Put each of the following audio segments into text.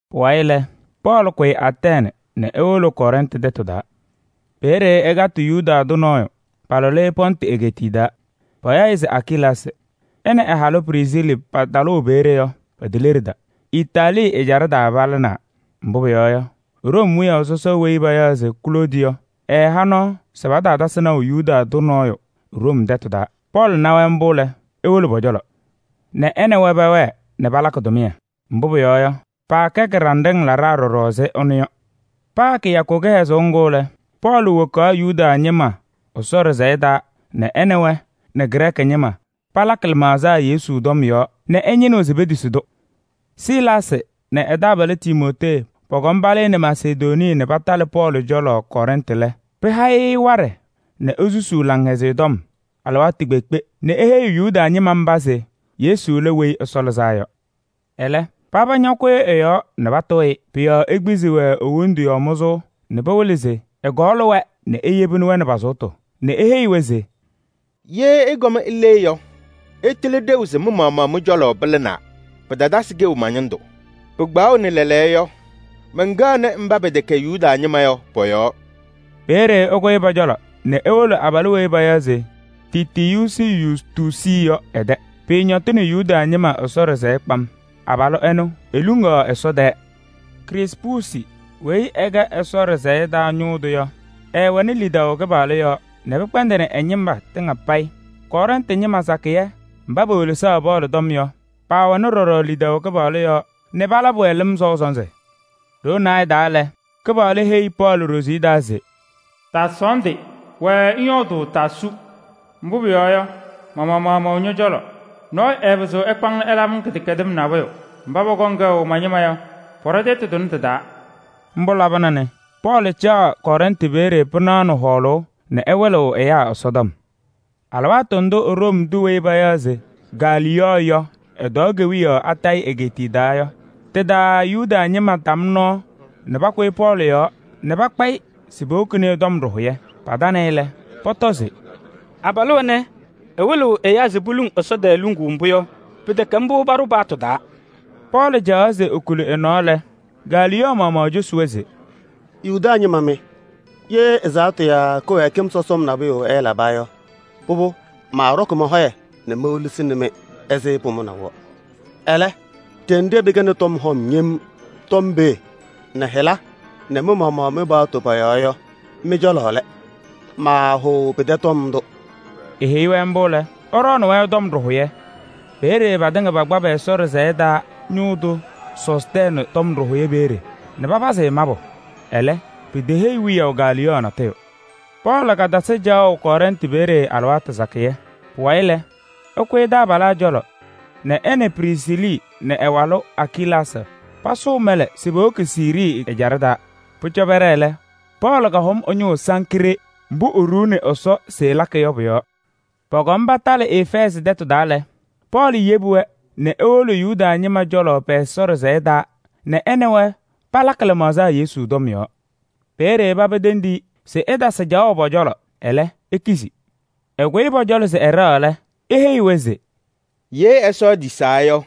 Pʋwayɩ lɛ, Pɔɔlɩ kʋyɩ Atɛɛnɩ nɛ ewolo Kɔrɛntɩ tɛtʋ taa. Peeye ɛkatɩ Yuda tʋ nɔɔyʋ, palʋlɩ-ɩ Pɔntɩ egeetiye taa. Payaɣ-ɩ se Akilaasɩ. Ɛ nɛ ɛ-halʋ Prisiili patalʋʋ peeye yɔ, piteleɖida. Itaalii ɛjaɖɛ taa palɩnaa, mbʋ pʋyɔɔ yɔ, Room wiyaʋ sɔsɔ weyi payaɣ se Kloodi yɔ ɛɛha nɔɔ se pataatasɩ naʋ Yuda tʋ nɔɔyʋ Room tɛtʋ taa. Pɔɔlɩ na-wɛ mbʋ lɛ, ewolo pɔ-cɔlɔ nɛ ɛ nɛ wɛ pɛwɛɛ nɛ palakɩ tʋmɩyɛ. Mbʋ pʋyɔɔ yɔ, paakɛ kɩɖanɖɩŋ laɖaa ɖɔɖɔ ɛzɩ ɛnʋ yɔ. Paa kɩyakʋ kɩhɛzʋʋ ŋgʋ lɛ, Pɔɔlɩ wokaɣ Yuda ñɩma Ɛsɔ ɖɩsɛyɛ taa nɛ ɛ nɛ wɛ nɛ Grɛɛkɩ ñɩma palakɩ lɩmaɣza Yesu tɔm yɔɔ nɛ ɛñɩnɩɣ se petisi-tʋ. Silaasɩ nɛ ɛ-taabalʋ Timootee pɔkɔm palɩnɩ Masedonii nɛ patalɩ Pɔɔlɩ cɔlɔ Kɔrɛntɩ lɛ, pɩha-ɩ waɖɛ nɛ esusuu Laŋhɛzɩyɛ Tɔm alɩwaatʋ kpeekpe nɛ eheyiɣ Yuda ñɩma mba se Yesu lɛ Weyi Ɛsɔ Lɩzaa Yɔ. Ɛlɛ, paba ñakʋyʋʋ ɛ-yɔɔ nɛ patʋʋ-ɩ. Pʋ-yɔɔ ekpizi-wɛ e-wondu yɔɔ mʋzʋʋ nɛ pɩwɩlɩ se ɛkɔɔlɩ-wɛ nɛ eyebi-wɛ nɛ pa-sʋʋtʋ nɛ eheyi-wɛ se: “Ye ɩkɔm ile yɔ, ɩtɩlɩ ɖeu se mɩ-maɣmaɣ mɩ-cɔlɔ pɩlɩnaa, pɩtatasɩ kɛʋ ma-ñɩndʋ. Pɩkpaɣʋnɩ lɛɛlɛɛyɔ yɔ, mɛnkɛɣnɩ mba pɛtɛkɛ Yuda ñɩma yɔ pɔ-yɔɔ.” Peeye ɛkʋyɩ pɔ-cɔlɔ nɛ ewolo abalʋ weyi payaɣ se Tiitiyuusi Yustuusi yɔ ɛ-tɛ. Pɩɩñɔtɩnɩ Yuda ñɩma Ɛsɔ ɖɩsɛyɛ kpam, abalʋ ɛnʋ eluŋaɣ Ɛsɔ tɛɛ. Krispuusi weyi ɛkɛ Ɛsɔ ɖɩsɛyɛ taa ñʋʋ tʋ yɔ, ɛɛwɛnɩ lidaʋ Kɩpaɣlʋ yɔɔ nɛ pɩkpɛndɩnɩ ɛ-ñɩma tɩŋa payɩ. Kɔrɛntɩ ñɩma sakɩyɛ mba pewelesaɣ Pɔɔlɩ tɔm yɔ, paawɛnɩ ɖɔɖɔ lidaʋ Kɩpaɣlʋ yɔɔ nɛ palabɩ-wɛ lɩm sɔʋ sɔnzɩ. Ɖoo naayɛ taa lɛ, Kɩpaɣlʋ heyi Pɔɔlɩ ɖoziye taa se: “Taasɔɔndɩ, wɛɛ ŋyɔɔdʋʋ, taasu. Mbʋ pʋyɔɔ yɔ, ma-maɣmaɣ mɛwɛ ñɔ-cɔlɔ. Nɔɔyʋ ɛɛpɩzɩɣ ɛkpa-ŋ nɛ ɛlabɩ-ŋ kɩdɛkɛdɩm nabʋyʋ. Mba pɔkɔŋ kɛʋ ma-ñɩma yɔ, pɔɖɔ tɛtʋ tʋnɛ tɩ-taa.” Mbʋ labɩna nɛ Pɔɔlɩ caɣ Kɔrɛntɩ peeye pɩnaɣ nɛ hɔɔlʋʋ nɛ ɛwɩlɩɣ ɛyaa Ɛsɔtɔm. Alɩwaatʋ ndʋ Room tʋ weyi payaɣ se Galiyɔɔ yɔ ɛtɔɔ kewiyaɣ Akayɩ egeetiye taa yɔ, tɩ-taa Yuda ñɩma tam nɔɔ nɛ pakʋyɩ Pɔɔlɩ yɔɔ nɛ pakpa-ɩ se powokini-i tɔm ɖɩhʋyɛ. Patanɩ-ɩ lɛ, pɔtɔ se: “Abalʋ ɛnɛ, ɛwɩlɩɣ ɛyaa se poluŋ Ɛsɔ tɛɛ luŋuu mbʋ yɔ, pɩtɛkɛ mbʋ paɖʋ paɣtʋ taa.” Pɔɔlɩ caɣaɣ se ekuli ɛ-nɔɔ lɛ, Galiyɔɔ maɣmaɣ cosi-wɛ se: “Yuda ñɩma mɩ! Ye ɛzaɣtʋ yaa kɩwɛɛkɩm sɔsɔm nabʋyʋ ɛɛlaba yɔ, pʋbʋ, maaɖɔkɩ mɔ-hɔyɛ nɛ mewelesini-mɩ ɛzɩ pʋmʋnaʋ yɔ. Ɛlɛ, ɖenɖe pɩkɛnɩ tɔm hɔm yem tɔm pee nɛ hɩla nɛ mɩ-maɣmaɣ mɩ-paɣtʋ pɔ-yɔɔ yɔ, mɩ-cɔlɔ lɛ. Maahʋʋ pɩtɛ tɔm ndʋ!” Eheyi-wɛ mbʋ lɛ, ɛɖɔɔnɩ-wɛ tɔm ɖɩhʋyɛ. Peeye patɩŋa pakpa pɛ-Ɛsɔ ɖɩsɛyɛ taa ñʋʋ tʋ Sɔstɛɛnɩ tɔm ɖɩhʋyɛ peeye nɛ papazɩ-ɩ mabʋ. Ɛlɛ, piteheyi wiyaʋ Galiyɔɔ natʋyʋ. Pɔɔlɩ katasɩ caɣʋ Kɔrɛntɩ peeye alɩwaatʋ sakɩyɛ. Pʋwayɩ lɛ, ɛkʋyɩ taabalaa cɔlɔ nɛ ɛ nɛ Prisiili nɛ ɛ-walʋ Akilaasɩ pasʋʋ mɛlɛ se powoki Siirii ɛjaɖɛ taa. Pʋcɔ pɛɖɛɛ lɛ, Pɔɔlɩ kahʋm ɛ-ñʋʋ Sankree mbʋ eɖuuni Ɛsɔ se ɛlakɩ yɔ pʋ-yɔɔ. Pɔkɔm patalɩ Efɛɛzɩ tɛtʋ taa lɛ, Pɔɔlɩ yebi-wɛ nɛ ewolo Yuda ñɩma cɔlɔ pɛ-Ɛsɔ ɖɩsɛyɛ taa nɛ ɛ nɛ wɛ palakɩ lɩmaɣza Yesu tɔm yɔɔ. Peeye paba tendi-i se ɛtasɩ caɣʋ pɔ-cɔlɔ. Ɛlɛ, ekizi. Ɛkʋyɩ pɔ-cɔlɔ se ɛɖɛɣ lɛ, eheyi-wɛ se: “Ye Ɛsɔ etisaa yɔ,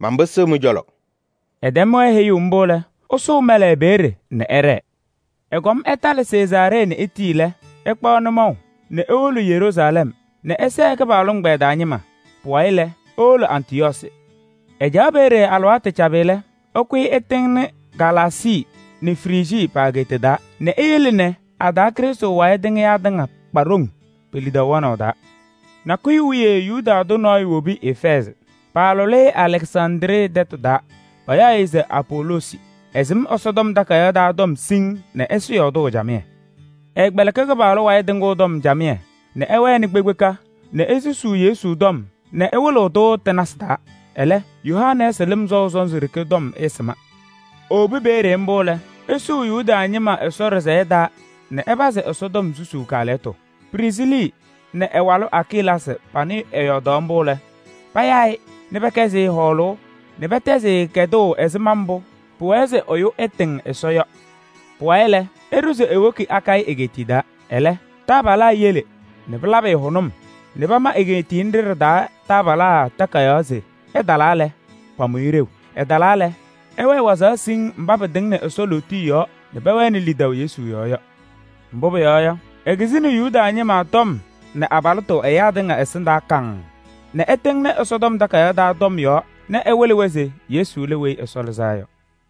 manpɩsɩɣ mɩ-cɔlɔ.” Ɛtɛm-wɛ heyuu mbʋ lɛ, ɛsʋʋ mɛlɛ peeye nɛ ɛɖɛɛ. Ɛkɔm ɛtalɩ Sezaaree nɛ etii lɛ, ɛkpaɣ nʋmɔʋ nɛ ewolo Yeruusalɛm nɛ ɛsɛɛ Krɩstʋ ɛgbɛyɛ taa ñɩma. Pʋwayɩ lɛ, ewolo Antɩyɔɔsɩ. Ɛcaɣ peeye alɩwaatʋ cabɩ lɛ, ɛkʋyɩ ɛtɩŋnɩ Galaasii nɛ Frijii pa-egeeta taa nɛ eyele nɛ a-taa Krɩstʋ wayɩ tɩŋɩyaa tɩŋa kpa ɖoŋ pe-lidaʋ wɛnaʋ taa. Nakʋyʋ wiye Yuda tʋ nɔɔyʋ wobi Efɛɛzɩ. Paalʋlɩ-ɩ Alɛksandrii tɛtʋ taa, payaɣ-ɩ se Apoloosi. Ɛsɩm Ɛsɔtɔm Takayaɣ taa tɔm siŋŋ nɛ ɛsɩ yɔɔdʋʋ camɩyɛ. Ɛɛkpɛlɩkɩ Kɩpaɣlʋ wayɩ tɩŋʋʋ tɔm camɩyɛ nɛ ɛwɛnɩ kpekpeka nɛ esusuu Yesu tɔm nɛ ɛwɩlɩɣ-tʋ tɩ-nasɩ taa. Ɛlɛ, Yohanɛɛsɩ lɩm sɔʋ sɔnzɩ ɖeke tɔm ɛɛsɩma. Ewobi peeye mbʋ lɛ, ɛsʋʋ Yuda ñɩma Ɛsɔ ɖɩsɛyɛ taa nɛ ɛpazɩ Ɛsɔtɔm susuu kaalɛyɩtʋ. Prisiili nɛ ɛ-walʋ Akilaasɩ panɩ ɛyɔɔdaɣ mbʋ lɛ, payaa-ɩ nɛ pɛkɛzɩ-ɩ hɔɔlʋʋ nɛ pɛtɛzɩ-ɩ kɛdʋʋ ɛzɩma mbʋ pʋwɛɛ se ɛyʋ ɛtɩŋ Ɛsɔ yɔ. Pʋwayɩ lɛ, ɛɖʋ se ewoki Akayɩ egeetiye taa. Ɛlɛ taabalaa yele nɛ pɩlabɩ-ɩ hʋnʋm nɛ pama egeetiye nɖɩ ɖɩ-taa taabalaa takayaɣ se ɛtalaa lɛ, pamʋ-ɩ ɖeu. Ɛtalaa lɛ, ɛwɛɛ wazaɣ siŋŋ mba pɩtɩŋnɩ Ɛsɔ lootiye yɔɔ nɛ pɛwɛnɩ lidaʋ Yesu yɔɔ yɔ. Mbʋ pʋyɔɔ yɔ, ekizini Yuda ñɩma tɔm nɛ abalɩtʋ ɛyaa tɩŋa ɛsɩndaa kaŋŋ nɛ ɛtɩŋnɩ Ɛsɔtɔm Takayaɣ taa tɔm yɔɔ nɛ ɛwɩlɩ-wɛ se Yesu lɛ Weyi Ɛsɔ Lɩzaa Yɔ.